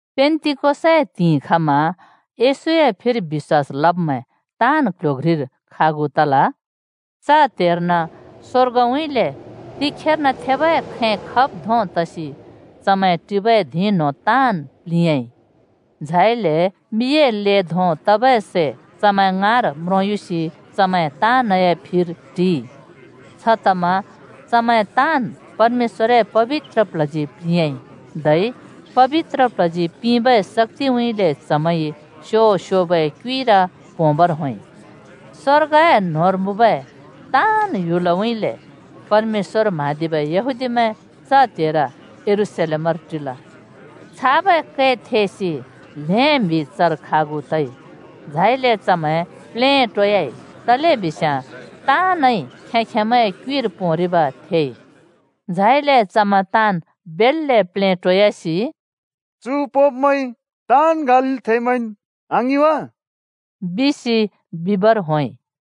पेन्‍तिकोसए त्हिंइर खमा, येशूए फिर बिश्‍वास लब्मैं ताँन् क्ल्ह्‍यो घ्रिर खागु तल। च त्हेर्न स्वर्गउँइँले तिखेर्न थेबै खैं खब् धों तसि चमैं टिबै धिं न्हों ताँन् प्लिंयाँइ। झाइले मिए ले धों तबै सै चमैं ङाँर म्रोंयुसि चमैं ताँनए फिर टिइ। छतमा चमैं ताँन् परमेश्‍वरए पबित्र प्ल्हजी प्लिंयाँइ, धै पबित्र प्ल्हजी पिंबै शक्‍तिउँइँले चमैंइ स्यो-स्योबै क्युइर पोंबर होंइ। स्वर्गए न्होंर मुँबै ताँन् ह्‍युलउँइँले परमेश्‍वर म्हाँदिबै यहूदीमैं च त्हेर यरूशलेमर टिल। छाबै कै थेसि ल्हें म्हि चर खागु तइ, झाइले चमैं प्लेटोयाइ तलेबिस्याँ ताँनइ खें-खेंमैंए क्‍युइर पोंरिब थेइ। झाइले चमैं ताँन् बेल्‍ले प्लेटोयासि, “चु पोंब्मैं ताँन् गालीलथेंमैंन् आङिं वा?” बिसि बिबर होंइ।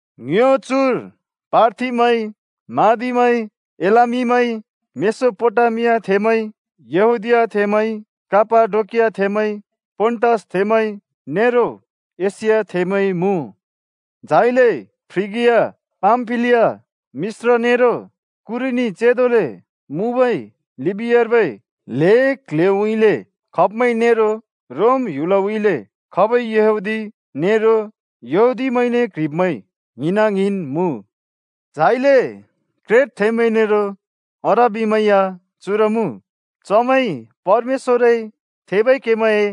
ङ्यो चुर पार्थीमैं, मादीमैं, एलामीमैं, मेसोपोटामियाथेंमैं, यहूदीयाथेंमैं, कापाडोकियाथेंमैं, पोन्‍टसथेंमैं नेरो एशियाथेंमैं मुँ। झाइले फ्रिगिया, पामफिलिया, मिश्र नेरो कुरेनी चेंदोले मुँबै लिबियार्बै ल्हें क्ल्ह्‍योउँइँले खब्मैं नेरो रोम ह्‍युलउँइँले खबै यहूदी नेरो यहूदीमैंने क्ह्रिब्मैं ङ्हिना ङ्हिन् मुँ। झाइले क्रेटथेंमैं नेरो अरबीमैं या चुर मुँ। चमैंइ परमेश्‍वरए थेबै केमैंए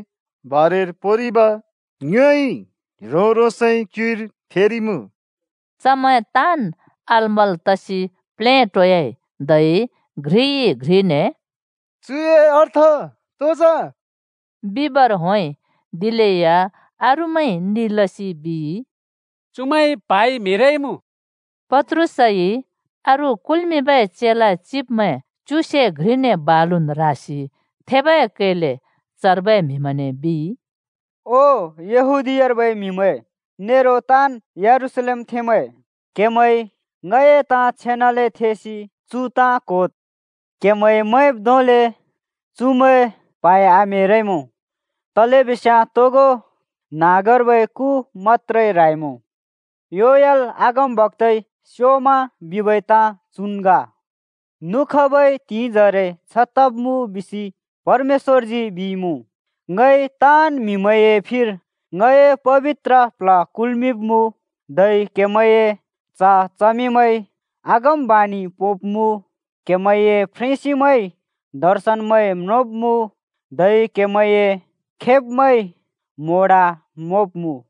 बारेर पोंरिब ङ्योइ ह्रों-ह्रोंसए क्युइर थेरिइमुँ!” चमैं ताँन् अलमल् तसि प्लेटोयाइ, धै घ्रिइ-घ्रिने “चुए अर्थ तो जा?” बिबर होंइ। दिलेया अरूमैंइ नि लसि बिइ, “चुमैं प्हाइ म्हे‍रइमुँ।” पत्रुसइ अरू कुल्मिंबै चेला चिब्मैं च्युसे घ्रिने बालुन् रासि थेबै कैले चर्बै म्हिमैंने बिइ, “ओ यहूदीयार्बै म्हिमैं, नेरो ताँन् यरूशलेमथेंमैं, क्हेमैंइ ङए ताँ छेनाले थेसि चु ताँ क्होद्। क्हेमैंइ मैंब् धोंले चुमैं प्हाइ आम्हेरइमुँ, तलेबिस्याँ तोगो न्हाँगर्बै कु मत्‍त्रे ह्राइमुँ। योएल अगमबक्‍ताइ स्योमा बिबै ताँ चुन् ग: ‘नुखबै त्हिंइजरे छ तब्मुँ बिसि परमेश्‍वरजी बिइमुँ, ङइ ताँन् म्हिमैंए फिर ङए पबित्र प्ल्ह कुल्मिंब्मुँ। धै क्‍हेमैंए च्‍ह-च्हमिमैंइ अगमवाणि पोंब्मुँ, क्‍हेमैंए फ्रेंसिंमैंइ दर्शनमैं म्रोंब्मुँ, धै क्‍हेमैंए खेब्मैंइ म्‍होंडा म्होंब्मुँ।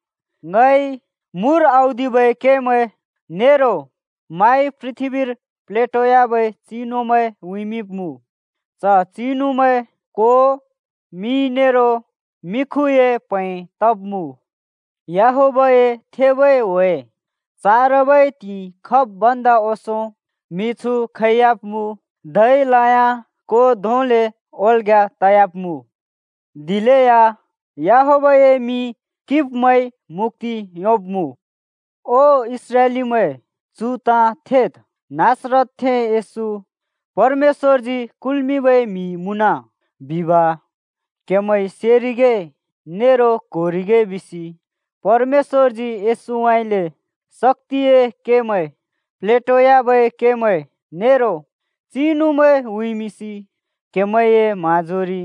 ङइ मुर औदिबै केमैं, नेरो माइ पृथ्‍बीर प्लेटोयाबै चिनुमैं उँइँमिंब्मुँ। च चिनुमैं को, मि नेरो मिखुए प्हैं तब्मुँ। याहवेहए थेबै ह्‍वे चारबै त्हिंइ खब् भन्दा ओंसों त्हिंयाँ मिछु खैयाब्मुँ, धै लयाँ को धोंले ओल्‍ग्‍या तयाब्मुँ। दिलेया याहवेहए मिं किंब्मैंइ मुक्‍ति योंब्मुँ।’ “ओ इस्राएलीमैं, चु ताँ थेद्, नासरतथें येशू परमेश्‍वरजी कुल्‍मिंबै म्‍हि मुँन बिब क्हेमैंइ सेरिगे नेरो क्होरिगे बिसि परमेश्‍वरजी येशूउँइँले शक्‍तिए केमैं, प्लेटोयाबै केमैं, नेरो चिनुमैं उँइँमिंसि क्हेमैंए म्हाँजोरि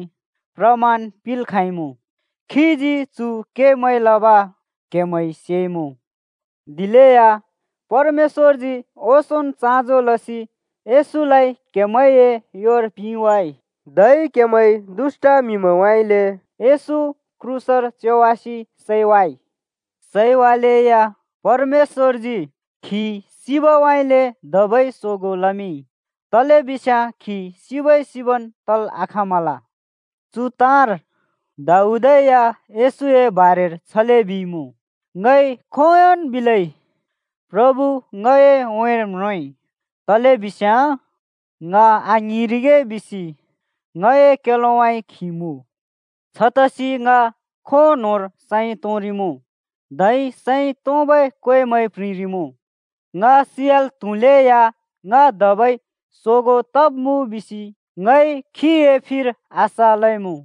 प्रमाण पिंल् खाँइमुँ। खीजी चु केमैं लब क्हेमैंइ सेइमुँ। दिलेया परमेश्‍वरजी ओंसोंन् चाँजो लसि येशूलाइ क्‍हेमैंए योर पिंवाँइ। धै दुष्‍ट म्हिमैंउँइँले क्हेमैंइ येशू क्रूसर च्योवासि सैवाइ। सैवालेया परमेश्‍वरजी खी सिबउँइँले धबै सोगों लमिंइ। तलेबिस्याँ खी सिबै सिबन् तल् आखाँमल। चु ताँर दाऊदइ या येशूए बारेर छले बिइमुँ, ‘ङइ खोंयोंन् बिलै प्रभु ङए उँइँर म्रोंइ, तलेबिस्याँ ङ आङ्हिंरिगे बिसि ङए क्‍योलोउँइँ खी मुँ। छतसि ङ खों न्होंर सैं तोंरिमुँ, धै सैं तोंबै क्वेमैं प्रिंरिमुँ। ङ सियाल् त्हुलेया ङ धबै सोगों तब्मुँ बिसि ङइ खीए फिर आशा लइमुँ।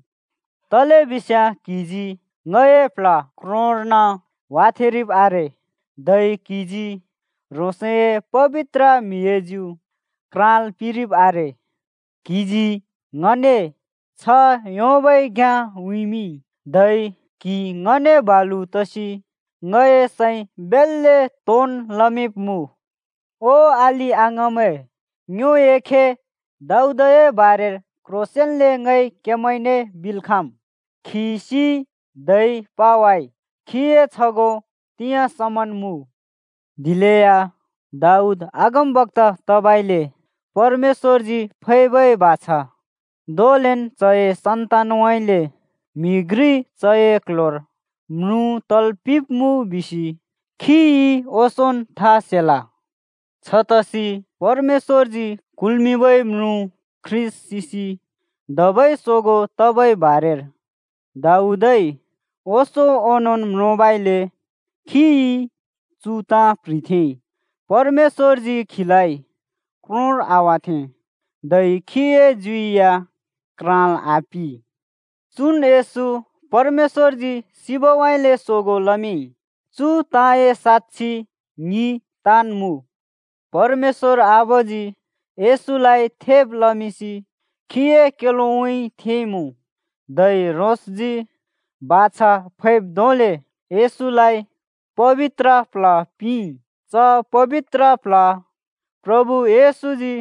तलेबिस्याँ क्हिजी ङए प्ल्ह क्रोंर्न वाथेंरिब् आरे, धै क्‍हिजी ह्रोंसए पबित्र म्हिए ज्यु क्राँल् पिंरिब् आरे। क्‍हिजी ङने छ्ह योंबै घ्‍याँ उँइँमिंइ, धै क्हि ङने बालु तसि ङए सैं बेल्‍ले तोंन् लमिंब्मुँ।’ “ओ अलि-अङाँमैं, ङ्योए खे दाऊदए बारेर क्ह्रोंसेंन्ले ङइ क्हेमैंने बिल् खाँम्। खी सिइ धै पावाइ, खीए छगों तिंयाँ समन् मुँ। दिलेया दाऊद अगमबक्‍ता तबइले परमेश्‍वरजी फैबै बाछा धोंलेन् चए सन्तानउँइँले म्हि घ्रि चए क्ल्ह्‍योर म्रुँ तल् पिंब्मुँ बिसि खिइ ओंसोंन् था सेल। छतसि परमेश्‍वरजी कुल्मिंबै म्रुँ ख्रीष्‍ट सिसि धबै सोगों तबै बारेर दाऊदइ ओंसों ओंनोंन् म्रोंबइले खिइ चु ताँ प्‍ह्रिथेंइ, ‘परमेश्‍वरजी खीलाइ क्रोंर आवाथें धै खीए ज्यु या क्राँल् आपिं।’ चुन् येशू परमेश्‍वरजी सिबउँइँले सोगों लमिंइ। चु ताँए साक्षि ङि ताँन् मुँ। परमेश्‍वर आबाजी येशूलाइ थेब् लमिंसि खीए क्‍योलोउँइँ थेंइँमुँ। धै ह्रोंसजी बाछा फैब् धोंले येशूलाइ पबित्र प्ल्ह पिंइ। च पबित्र प्ल्ह प्रभु येशूजी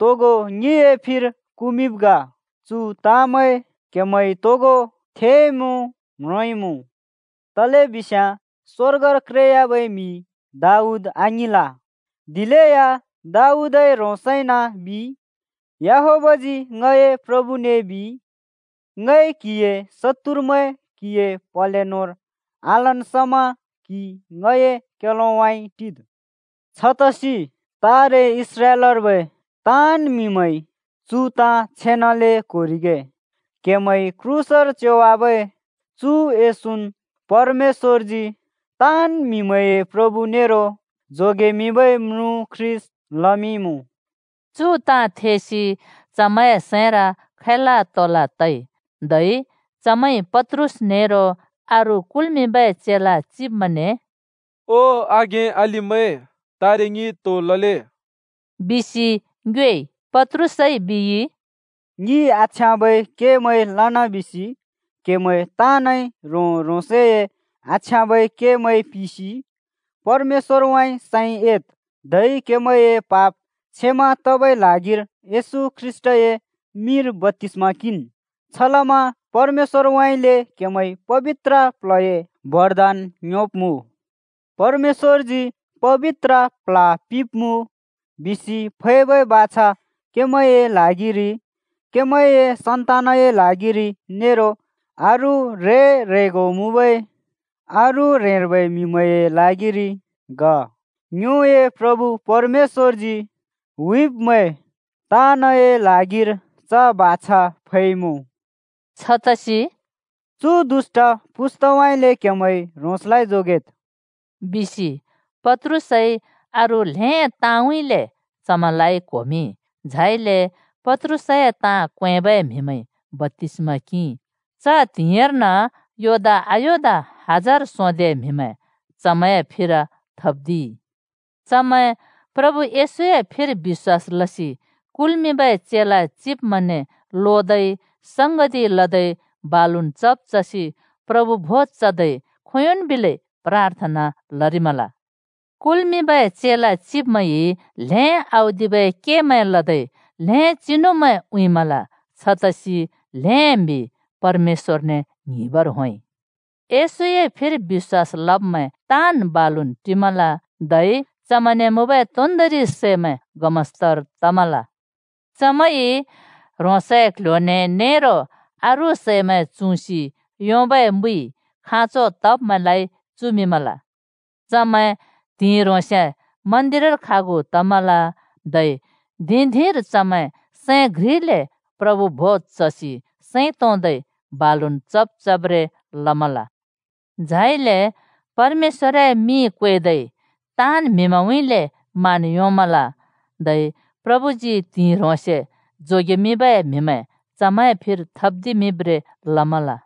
तोगो ङिए फिर कुमिंब् ग। चु ताँमैं क्हेमैंइ तोगो थेइमुँ, म्रोंइमुँ। तलेबिस्याँ स्वर्गर क्रेयाबै म्हि दाऊद आङिंल, दिलेया दाऊदइ ह्रोंसै‍न बिइ, ‘याहवेहजी ङए प्रभुने बिइ, ङइ क्‍हिए शत्तुरमैं क्‍हिए प्‍हले न्होंर आलन् समा क्हि ङए क्‍योलोउँइँ टिद्।’ छतसि तारे इस्राएलर्बै ताँन् म्‍हिमैंइ चु ताँ छेनाले क्होरिगे: क्हेमैंइ क्रूसर च्योवाबै चु येशून् परमेश्‍वरजी ताँन् म्हिमैंए प्रभु नेरो जोगेमिंबै म्रुँ ख्रीष्‍ट लमिंइँमुँ।” चु ताँ थेसि चमैंए सैंर खैला तोला तइ। धै चमैंइ पत्रुस नेरो अरू कुल्मिंबै चेला चिब्मैंने “ओ आघें-अलिमैं, तारे ङिइ तो लले?” बिसि ङ्योएइ। पत्रुसइ बिइ, “ङिइ आछ्याँबै केमैं लना बिसि क्‍हेमैं ताँनइ‍ ह्रों-ह्रोंसए आछ्याँबै केमैं पिसि परमेश्‍वरउँइँ सैं एद्, धै क्हेमैंए पाप क्षमा तबै ल्हागिर येशू ख्रीष्‍टए मिंर बप्‍तिस्‍मा किंन्। छलमा परमेश्‍वरउँइँले क्हेमैंइ पबित्र प्ल्हए बरदान योंब्मुँ। परमेश्‍वरजी ‘पबित्र प्ल्ह पिंब्मुँ’ बिसि फैबै बाछा क्हेमैंए ल्हागिरि, क्हेमैंए सन्तानए ल्हागिरि, नेरो अरू ह्रें-ह्रेंगो मुँबै अरू ह्रेंर्बै म्हिमैंए ल्हागिरि ग। ङ्योए प्रभु परमेश्‍वरजी हुइब्मैं ताँनए ल्हागिर च बाछा फैइमुँ।” छतसि “चु दुष्‍ट पुस्‍ताउँइँले क्हेमैंइ ह्रोंसलाइ जोगेद्,” बिसि पत्रुसइ अरू ल्‍हें ताँउँइँले चमैंलाइ क्होमिंइ। झाइले पत्रुसए ताँ क्वेंबै म्हिमैंइ बप्‍तिस्मा किंइ। च त्हिंइर्न योदा आयोदा हजार सोंदे म्हिमैं चमैंए फिर थब्दिइ। चमैं प्रभु येशूए फिर बिश्‍वास लसि कुल्मिंबै चेला चिब्मैंने लोदै, संगति लदै, बालुन् चब् चसि प्रभु भोज चदै, खोंयोंन् बिलै प्राथना लरिमल। कुल्मिंबै चेला चिब्मैंइ ल्हें औदिबै केमैं लदै ल्हें चिनुमैं उँइँमल। छतसि ल्हें म्हि परमेश्‍वरने ङ्हिंबर होंइ। येशूए फिर बिश्‍वास लब्मैं ताँन् बालुन् टिमल, धै चमैंने मुँबै तोन्दोंरि सैमैं गमस्तर तमल। चमैंइ ह्रोंसए क्‍ल्‍ह्‍यो न्‍हें नेरो अरू सैमैं चुँसि योंबै मुइ खाँचो तब्मैंलाइ चुमिंमल। चमैं त्हिंइ ह्रोंसे मन्दिरर खागु तमल, धै धिं-धिंर चमैं सैं घ्रिले प्रभु भोज चसि सैं तोंदै बालुन् चब् चब्रें लमल। झाइले परमेश्‍‍वरए मिं क्वेदै, ताँन् म्हिमैंउँइँले मान योंमल। धै प्रभुजी त्हिंइ ह्रोंसे जोगेमिंबै म्‍हिमैं चमैंए फिर थप्‍दिमिंब्रें लमल।